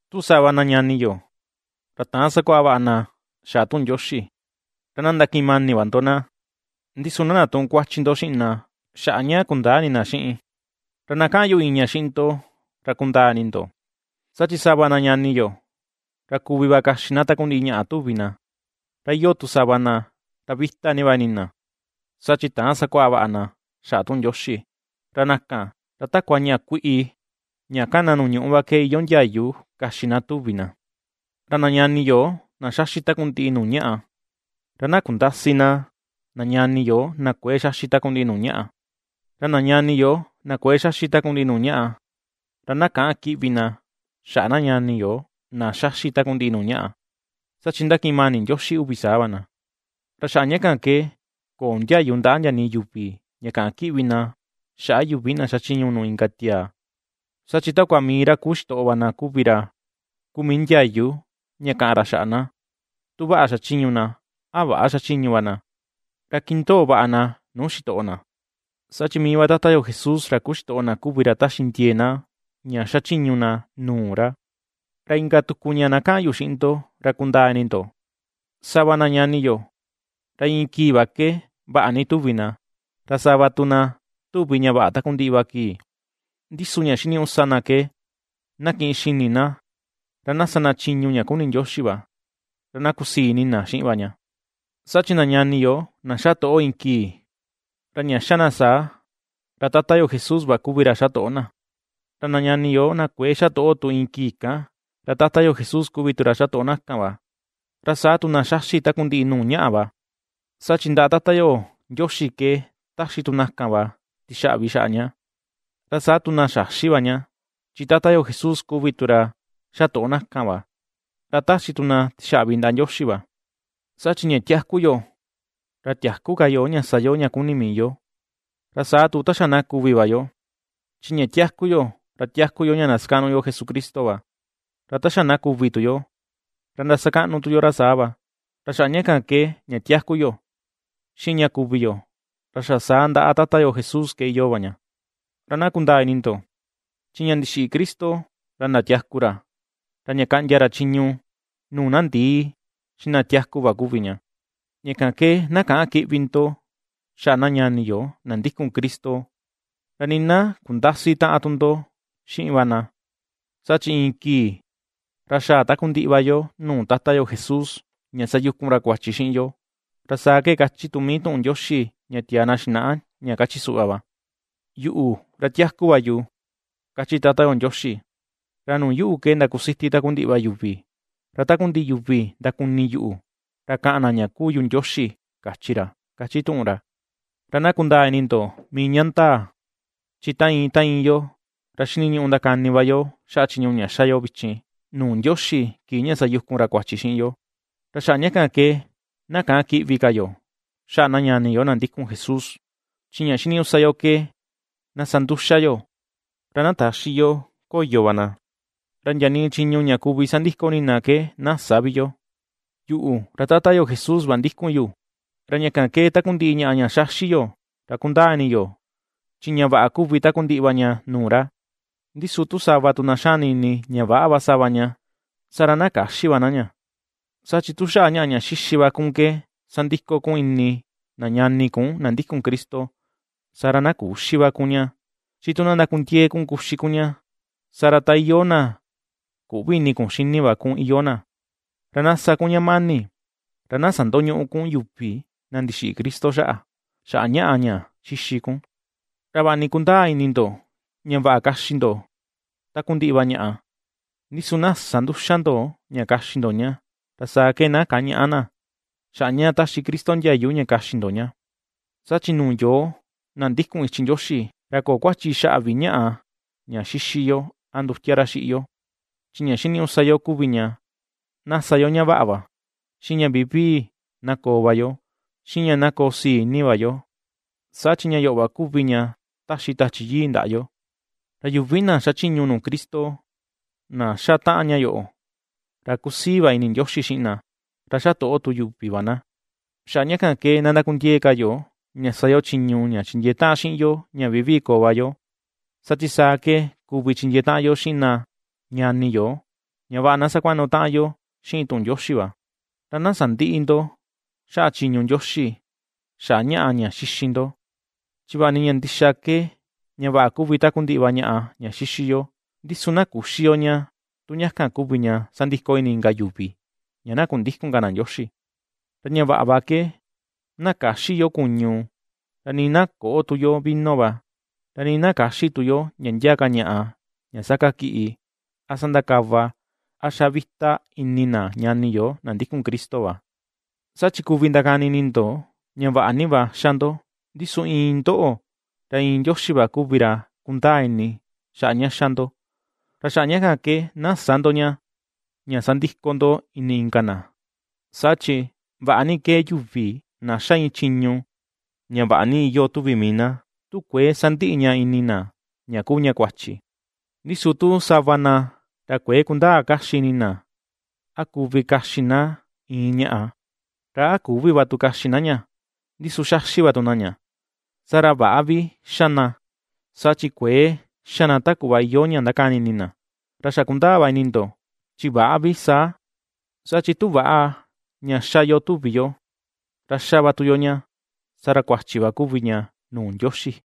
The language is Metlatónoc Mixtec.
Tu sava na ñani yo, ra täan sakuaꞌa vaꞌa na xaꞌa tuꞌun Ndioxi, ra na ndakiꞌin mani va ndo na, ndi su na ndatüꞌun kuachi ndo xiꞌin na xaꞌa ña kundäa ini na xiꞌin. Ra na kaꞌan yu iin ña xiꞌin ndo, ra kundaa ini ndo, saa chi sava na ñani yo, ra kuvi va kaxi na takundiꞌi ñaꞌa tuvi na, ra iyoo tu sava na, ra vita va ini na, saa chi täan sakuaꞌa vaꞌa na xaꞌa tuꞌun Ndioxi. Ra na kan, ra takua ñaꞌa kuiꞌi ña kana nuu ñuꞌu va ke iyoo ndiayu kaxi na tuvi na. Ra na ñani yo, na xaxi takundiꞌi nuu ñaꞌa, ra na kundäsi na, na ñani yo, na kuëe xaxi takundiꞌi nuu ñaꞌa; ra na ñani yo na kuëe xaxi takundiꞌi nuu ñaꞌa, ra na käꞌan kiꞌvi na xaꞌa na ñani yo na xaxi takundiꞌi nuu ñaꞌa, saa chi ^ndakiꞌin mani Ndioxi uvi saa va na. Ra xaꞌa ña kan ke köo ndiayu ndaꞌa ndia nii yuvi ña kaꞌan kiꞌvi na xaꞌa yuvi na xachiñu nuu inka tiaa. Saa chi takua mii ra kuu xitoꞌo va na kuvi ra kuu mii ndiayu ña kaꞌan ra xaꞌa na, tu vaꞌa xachiñu na, a väꞌa xachiñu va na. Ra kindoo vaꞌa na nuu xitoꞌo na, saa chi mii va Tata yo Jesús ra kuu xitoꞌo na kuvi ra ^taxi ndiee na ña ^xachiñu na nuu ra. Ra inka tuku ña na kaꞌan yu xiꞌin ndo, ra kundaa ini ndo: Sava na ñani yo, ra iin kii va ke vaꞌa ni tuvi na, ra sava tu na tuvi ña vaꞌa takundiꞌi va kii. Ndi su ña xiniñuꞌu sa na ke na kiꞌin xini na ra na sa na chiñu ña kuni Ndioxi va, ra na kusii ini xiꞌin va ña. Saa chi na ñani yo na xa toꞌo iin kii, ra ña xa na saa, ra Tata yo Jesús va kuvi ra xa toꞌo na; ra na ñani yo na kuëe xa toꞌo tu iin kii kan, ra Tata yo Jesús kuvi tu ra xa toꞌo na kan va. Ra saa tu na xaxi takundiꞌi nuu ñaꞌa va, saa chi ndaꞌa Tata yo Ndioxi ke ^taxi tu na kan va tixaꞌvi xaꞌa ña; ra saa tu na xäxi va ña, chi Tata yo Jesús kuvi tu ra xa toꞌo na kan va, ra ^taxi tu na tixaꞌvi ndaꞌa Ndioxi va. Saa chi ña tiaku yo, ra tiäku ka yo ña sa yo ña kuni mii yo, ra saa tu ta xa na kuvi va yo. Chi ña tiaku yo, ra tiaku yo ña ndasakaꞌnu yo Jesucristo va, ra ta xa na kuvi tu yo, ra ndasakaꞌnu tu yo ra saa va. Ra xaꞌa ña kan ke ña tiaku yo, xiꞌin ña kuvi yo, ra xa saa ndaꞌa Tata yo Jesús ke iyoo va yo. Ra na kundaa ini ndo, chi ña ndixiꞌi Cristo, ra ndatiaku ra, ra ña kaꞌndia ra chiñu nuu na ndii, xiꞌin na tiaku va kuvi ña. Ña kan ke na käꞌan kiꞌvi ndo xaꞌa na ñani yo na ndikun Cristo, ra nii na kundäsi taꞌan tu ndo xiꞌin va na, saa chi iin kii, ra xaa takundiꞌi va yo nuu Tata yo Jesús ña sayukun ra kuachi xiꞌin yo. Ra saa ke kachi tu mii tuꞌun Ndioxi ña tiaa na xinaꞌa, ña kachi suꞌva va: Yuꞌu, ra tiaku va yu, kachi Tata yo Ndioxi, ra nuu yuꞌu ke ndakusiti takundiꞌi va yuvi. Ra takundiꞌi yuvi ndakuni yuꞌu ra kaꞌan na ña kuu yu Ndioxi, kachi ra, ^kachi tuꞌun ra. Ra na kundaa ini ndo mii ña ndaa, chi ta iin, ta iin yo, ra xiniñuꞌu ndakani va yo xaꞌa chiñu ña xa yo vichin, nuu Ndioxi kii ña sayukun ra kuachi xiꞌin yo. Ra xaꞌa ña kan ke na käꞌan kiꞌvi ka yo xaꞌa na ñani yo na ndikun Jesús, chi ña xiniñuꞌu sa yo ke na sa nduxa yo, ra na täxi yo koyo va na, ra ndia nii chiñu ña kuvi sandiko ini na ke na sä vi yo. Yuꞌu, ra Tata yo Jesús va ndikun yu, ra ña kan ke takundiꞌi ñaꞌa ña xaxi yo, ra kundaa ini yu chi ña vaꞌa kuvi takundiꞌi va ña nuu ra; ndi su tu sava tu na xani ini ña väꞌa va sava ña, saa ra na käxi va na ña. Saa chi tu xaꞌa ñaꞌa ña xixi va kun ke sandiko kun ini na ñani kun na ndikun Cristo, saa ra na küxi ka va kun ña, chi tu na ndakundiee kun kuxi kun ña, saa ra ta iyoo na küꞌvi ini kun xini va kun iyoo na. Ra na sa kun ña mani, ra na sandoñüꞌu kun yuvi na ndixiꞌi Cristo xaꞌa, xaꞌa ñaꞌa ña xixi kun. Ra vaꞌa ni kundaa ini ndo ña vaꞌa kaxi ndo takundiꞌi va ñaꞌa, ndi su na sä nduxa ndo ña kaxi ndo ña, ra saa ke na kañäꞌa na, xaꞌa ña taxi Cristo ndiayu ña kaxi ndo ña. Saa chi nuu yoo, na ndikun ichi Ndioxi, ra köo kuachi xaꞌa vi ñaꞌa ña xixi yo, a ndutia ra xiꞌi yo. Chi ña xiniñuꞌu sa yo kuvi ña, na sa yo ña vaꞌa va, xiꞌin ña vivii na koo va yo, xiꞌin ña na koo sii ini va yo, saa chi ña yoꞌo va kuvi ña taxi Tachi Yii ndaꞌa yo. Ra yuvi na xachiñu nuu Cristo na xa taꞌan ña yoꞌo, ra ^kusii va ini Ndioxi xiꞌin na, ra ^xa toꞌo tu yuvi va na. Xaꞌa ña kan ke na ndakundiee ka yo, ña sa yo chiñu ña chindiee taꞌan xiꞌin yo ña vivii koo va yo, saa chi saa ke kuvi chindiee taꞌan yo xiꞌin na ñani yo, ña vaꞌa na sakuaꞌnu taꞌan yo xiꞌin tuꞌun Ndioxi va. Ra na sandïꞌi ndo xaꞌa chiñu Ndioxi, xaꞌa ñaꞌa ña xixi ndo. Chi vaꞌa ni ña ndixa ke ña vaꞌa kuvi takundiꞌi va ñaꞌa ña xixi yo; ndi su na küxi yo ña tu ña kan kuvi ña sandiko ini inka yuvi, ña na kundïkun ka na Ndioxi. Ra ña vaꞌa va ke, na käxi yo kuñu, ra nii na köꞌo tu yo vino va, ra nii na käxi tu yo ndia ndia ka ñaꞌa ña sakakiꞌi, a sandakava, a xa vita ini na ñani yo na ndikun Cristo va. Saa chi kuvi ndakani ini ndo, ña vaꞌa ni va xa ndo, ndi su iin ndoꞌo, ra iin Ndioxi va kuvi ra kundaa ini xaꞌa ña xa ndo, ra xaꞌa ña kan na sä ndo ña, ña sandiko ndo ini inka na. Saa chi ¡vaꞌa ni kee yuvi na ^xa iin chiñu, ña vaꞌa ni iyoo tuvi mii na, tu kuëe sandiꞌi ña ini na ña kuu ña kuachi! Ndi su tu sava na ra kuëe kundaa kaxi vaꞌa ini na a kuvi kaxi na iin ñaꞌa, ra a küvi va tu kaxi na ña, ndi su xaxi va tu na ña, saa ra väꞌa vi xa na, saa chi kuëe xa na ta kuꞌva iyoo ña ndakani ini na. Ra xa kundaa va ini ndo, chi väꞌa vi saa, saa chi tu väꞌa ña ^xa yo tuvi yo, ra ^xa va tu yo ña, saa ra kuachi va kuvi ña nuu Ndioxi.